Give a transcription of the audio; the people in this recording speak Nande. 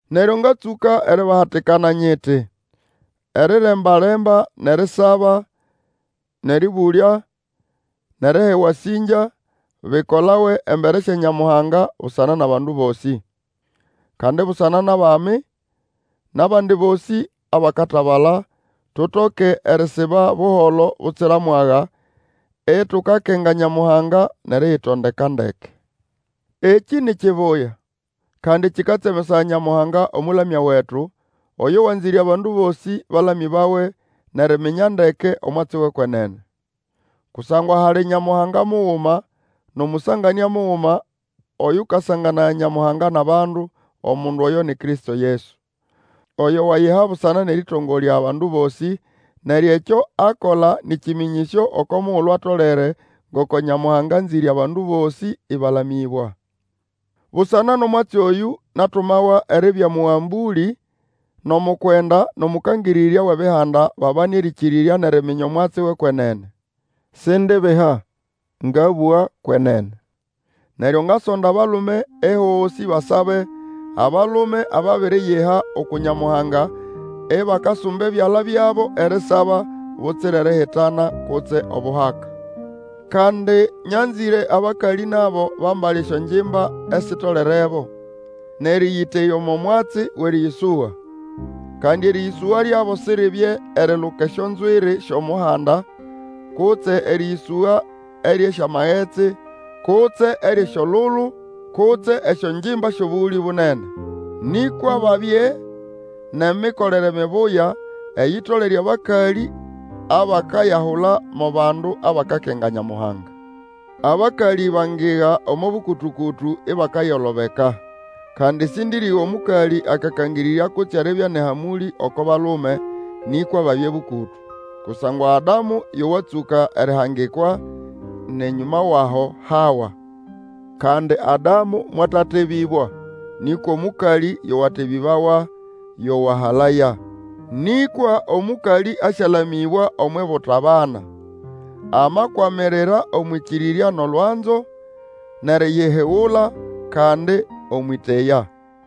Neryo ngatsũka eribahatikana nyiti, Eriremba-lemba, nʼerisaba, nʼerĩbũlya, nʼeriha ewasĩngya, bikolawe embere sya Nyamuhanga, busana nʼabandu bosĩ. Kandi busana nʼabami, nʼabandi bosĩ abakatabala, tutoke erisiba buholo butsira mwaga, itukakenga Nyamuhanga, nʼeriyitondeka ndeke. Ekĩ ni kibuya, kandi kĩkatsemesaya Nyamuhanga Omũlamya wetu, oyo wanzĩre abandu bosĩ balamĩbawe, nʼeriminya ndeke omwatsi wʼekwenene. Kusangwa hali Nyamuhanga muguma, nʼOmũsanganĩa muguma, oyũkasanganaya Nyamuhanga nʼabandu, omundu oyo ni Kristo Yesu, oyo wayiha busana nʼerĩtongolya abandu bosĩ. Neryo ekyo akola nĩ kĩmĩnyĩsyo oko mugulu atolere ngoko Nyamuhanga anzĩre abandu bosĩ ĩbalamĩbwa. Busana nʼomwatsi oyũ, natumawa eribya Omũgambũlĩ, nʼomukwenda, nʼOmũkangĩrĩrya wʼebihanda babane erĩkĩrĩrya nʼeriminya omwatsi wʼekwenene. Sindibiha, ngabũga kwenene. Neryo ngasonda abalume ehosĩ basabe, abalume ababiriyiha uku Nyamuhanga ibakasumba ebyala byabo erisaba, butsira erihitana kutse obuhaka. Kandi nyanzĩre abakalĩ nabo bambale esyongimba esitolerebo, nʼerĩyĩteya omo mwatsi wʼerĩyĩsũga. Kandi erĩyĩsũga lyabo siribye eriluka esyonzwiri syo muhanda, kutse erĩyĩsũga eryʼesyamagetsi, kutse eryʼesyolulu, kutse esyongimba syʼobũgũlĩ bunene. Nĩkwa babye nʼemikolere mibuya, eyitolere abakalĩ abakayahula mo bandu abakakenga Nyamuhanga. Abakalĩ bangiga omo bũkũtũ-kũtũ ibakayolobeka. Kandi sĩndĩrĩga omũkalĩ akakangĩrĩrya kutse eribya nʼehamũlĩ oko balume, nĩkwa babye bũkũtũ. Kusangwa Adamu yo watsũka erihangikwa, nʼenyũma wʼaho Hawa. Kandi Adamu mwatatebĩbwa, nĩkwa omũkalĩ yo watebĩbawa, yo wahalaya. Nĩkwa omũkalĩ asyalamĩbwa omwʼibuta bana, amakwamirira omwʼĩkĩrĩrya nʼolwanzo, nʼeriyihigula, kandi omwʼĩteya.